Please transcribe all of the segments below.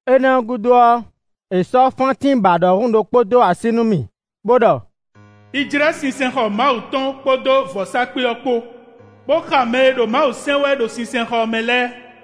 Énɛ́ ɔ́ gúdo ɔ́, è sɔ́ fántín bǎ ɖɔhun ɖokpó dó así nú mì bó ɖɔ: “Yi jlɛ́ sinsɛnxɔ Mawu tɔn kpódó vɔ̌sákpe ɔ́ kpó, bó xa mɛ e ɖo Mawu sɛn wɛ ɖo sinsɛnxɔ ɔ́ mɛ lɛ́ɛ.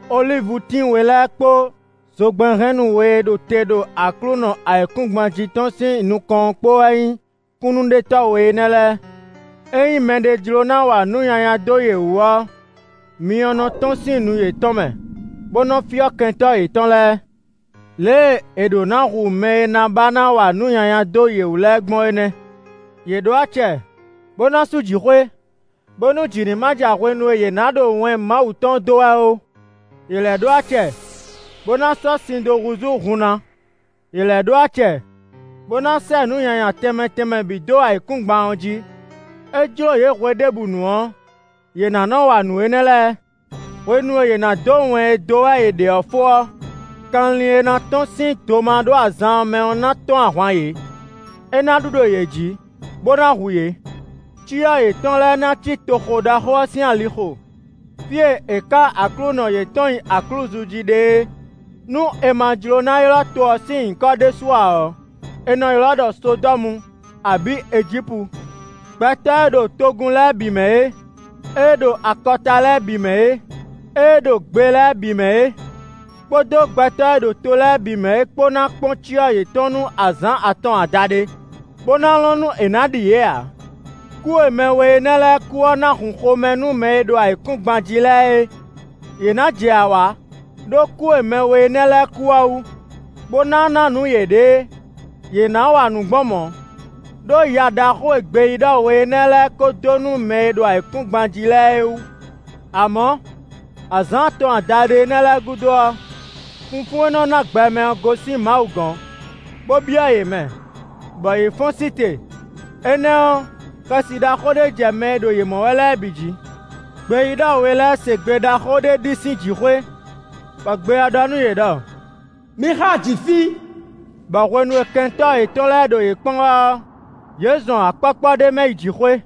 Olívutín we lɛ́ɛ kpó zogbɛ́nhɛnnú we e ɖo te ɖo Aklúnɔ ayǐkúngban jí tɔn sín nukɔn ɔ́ kpó wɛ nyí kúnnuɖetɔ́ we énɛ́ lɛ́ɛ. Ényí mɛɖé jló ná wa nǔ nyanya dó yě wú ɔ́, myɔ nɔ tɔ́n sín nu yětɔn mɛ bó nɔ fyɔ́ kɛntɔ́ yětɔn lɛ́ɛ. Lě e è ɖǒ ná hu mɛ e ná ba ná wa nǔ nyanya dó yě wú lɛ́ɛ gbɔn é nɛ́. Yě ɖó acɛ, bó ná sú jǐxwé, bónú jǐ ní ma ja hwenu e yě ná ɖo wɛn Mawu tɔn dó wɛ ɔ́ ó. Yě lɛ́ ɖó acɛ bó ná sɔ́ sin dó húzú hun ná; yě lɛ́ ɖó acɛ bó ná sɛ́ nǔ nyanya tɛnmɛ tɛnmɛ bǐ dó ayǐkúngban ɔ́ jí. É jló yě hweɖěbǔnu ɔ́, yě ná nɔ wa nǔ énɛ́ lɛ́ɛ. Hwenu e yě ná dó wɛn e dó wɛ yě ɖe ɔ́ fó ɔ́, kanlin e ná tɔ́n sín domaɖó-azan ɔ́ mɛ ɔ́ ná tɔ́n ahwan yě; é ná ɖu ɖo yě jǐ, bó ná hu yě. Cyɔ yětɔn lɛ́ɛ ná cí toxo ɖaxó ɔ́ sín alixo, fí e è ká Aklúnɔ yětɔn nyi aklúzu jí ɖe é. Nú è ma jló ná ylɔ́ to ɔ́ sín nyǐkɔ ɖésú ǎ ɔ́, è nɔ ylɔ́ ɖɔ Sodɔ́mu abǐ Ejípu. Gbɛtɔ́ e ɖo togun lɛ́ɛ bǐ mɛ é, ée ɖo akɔta lɛ́ɛ bǐ mɛ é, ée ɖo gbe lɛ́ɛ bǐ mɛ é, kpódó gbɛtɔ́ e ɖo to lɛ́ɛ bǐ mɛ é kpó ná kpɔ́n cyɔ yětɔn nú azǎn atɔn adaɖé, bó ná lɔn nú è nǎ ɖi yě ǎ. Kú e mɛ we énɛ́ lɛ́ɛ kú ɔ́ ná hun xomɛ nú mɛ e ɖo ayǐkúngban jí lɛ́ɛ é; yě ná jɛ awǎ ɖó kú e mɛ we énɛ́ lɛ́ɛ kú ɔ́ wú, bó ná ná nǔ yěɖée; yě ná wa nǔ gbɔn mɔ̌, ɖó ya ɖaxó e gbeyíɖɔ we énɛ́ lɛ́ɛ ko dó nú mɛ e ɖo ayǐkúngban jí lɛ́ɛ wú. Amɔ̌, azǎn atɔn adaɖé énɛ́ lɛ́ɛ gúdo ɔ́, funfún e nɔ ná gbɛ mɛ ɔ́, gosín Mawu gɔ̌n, bó byɔ́ yě mɛ, bɔ yě fɔ́n sí te; énɛ́ ɔ́, xɛsi ɖaxó ɖé jɛ mɛ e ɖo yě mɔ wɛ lɛ́ɛ bǐ jǐ. Gbeyíɖɔ we lɛ́ɛ se gbe ɖaxó ɖé ɖi sín jǐxwé, bɔ gbe ɔ́ ɖɔ nú yě ɖɔ: “Mi xá jǐ fí.” Bɔ hwenu e kɛntɔ́ yětɔn lɛ́ɛ ɖo yě kpɔ́n wɛ ɔ́, yě zɔn akpɔ́kpɔ́ ɖé mɛ yi jǐxwé.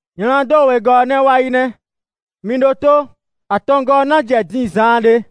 Nyladó wegɔ́ ɔ́ nɛ́ wá yí nɛ́; mi ɖótó. Atɔngɔ́ ɔ́ ná jɛ dín zaanɖé.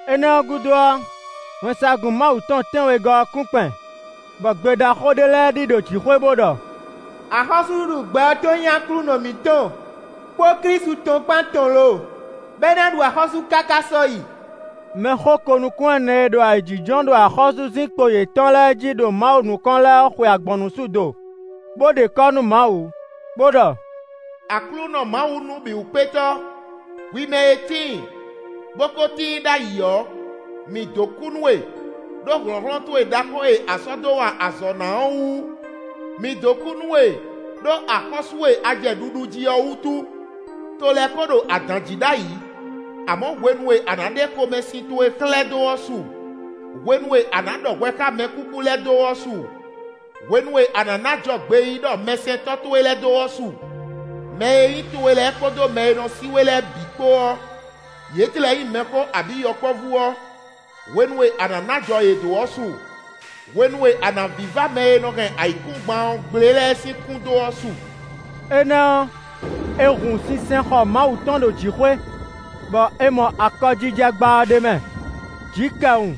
Énɛ́ ɔ́ gúdo ɔ́, wɛnsagun Mawu tɔn tɛ́nwegɔ́ ɔ́ kún kpɛn, bɔ gbe ɖaxó ɖé lɛ́ɛ ɖi ɖo jǐxwé bó ɖɔ: “Axɔ́súɖuɖu gbɛ ɔ́ tɔn nyí Aklúnɔ mǐtɔn kpó Klísu tɔn kpán tɔn lo! Bɔ é ná ɖu axɔ́sú káká sɔ́yi.” Mɛxó ko-nukún-ɛnɛ e ɖo ayǐjínjɔ́n ɖo axɔ́súzinkpo yětɔn lɛ́ɛ jí ɖo Mawu nukɔn lɛ́ɛ ɔ́, xwe agbɔ̌nnusú do, bó ɖe kɔ́ nú Mawu, bó ɖɔ: “Aklúnɔ Mawu Nǔbǐwúkpétɔ́, hwi mɛ e tíin, bó ko tíin ɖ'ayǐ ɔ́, mǐ dó kú nú we, ɖó hlɔ̌nhlɔ́n towe ɖaxó e a sɔ́ dó wa azɔ̌ ná ɔ́ wú; mǐ dó kú nú we ɖó axɔ́sú e a jɛ ɖuɖu jí ɔ́ wútu. To lɛ́ɛ ko ɖo adǎn jí ɖ'ayǐ, amɔ̌ hwenu e a nǎ ɖe xomɛsin towe xlɛ́ dó ɔ́ su; hwenu e a nǎ ɖɔ hwɛ xá mɛkúkú lɛ́ɛ dó ɔ́ su; hwenu e a nǎ ná ajɔ gbeyíɖɔ mɛsɛntɔ́ towe lɛ́ɛ dó ɔ́ su. Mɛ e nyí towe lɛ́ɛ kpódó mɛ e nɔ sí we lɛ́ɛ bǐ kpó ɔ́, yě tlɛ nyí mɛxó abǐ yɔkpɔ́vú ɔ́, hwenu e a nǎ ná ajɔ yě dó ɔ́ su; hwenu e a nǎ vívá mɛ e nɔ hɛn ayǐkúngban ɔ́ gblé lɛ́ɛ sín kún dó ɔ́ su.” Énɛ́ ɔ́, è hun sinsɛnxɔ Mawu tɔn ɖo jǐxwé, bɔ è mɔ akɔjijɛgbá ɔ́ ɖ'é mɛ. Jǐkɛwun,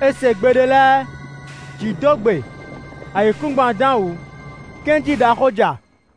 è se gbe ɖé lɛ́ɛ; jǐ dó gbe; ayǐkúngban dán wǔ; kɛ́njí ɖaxó ja.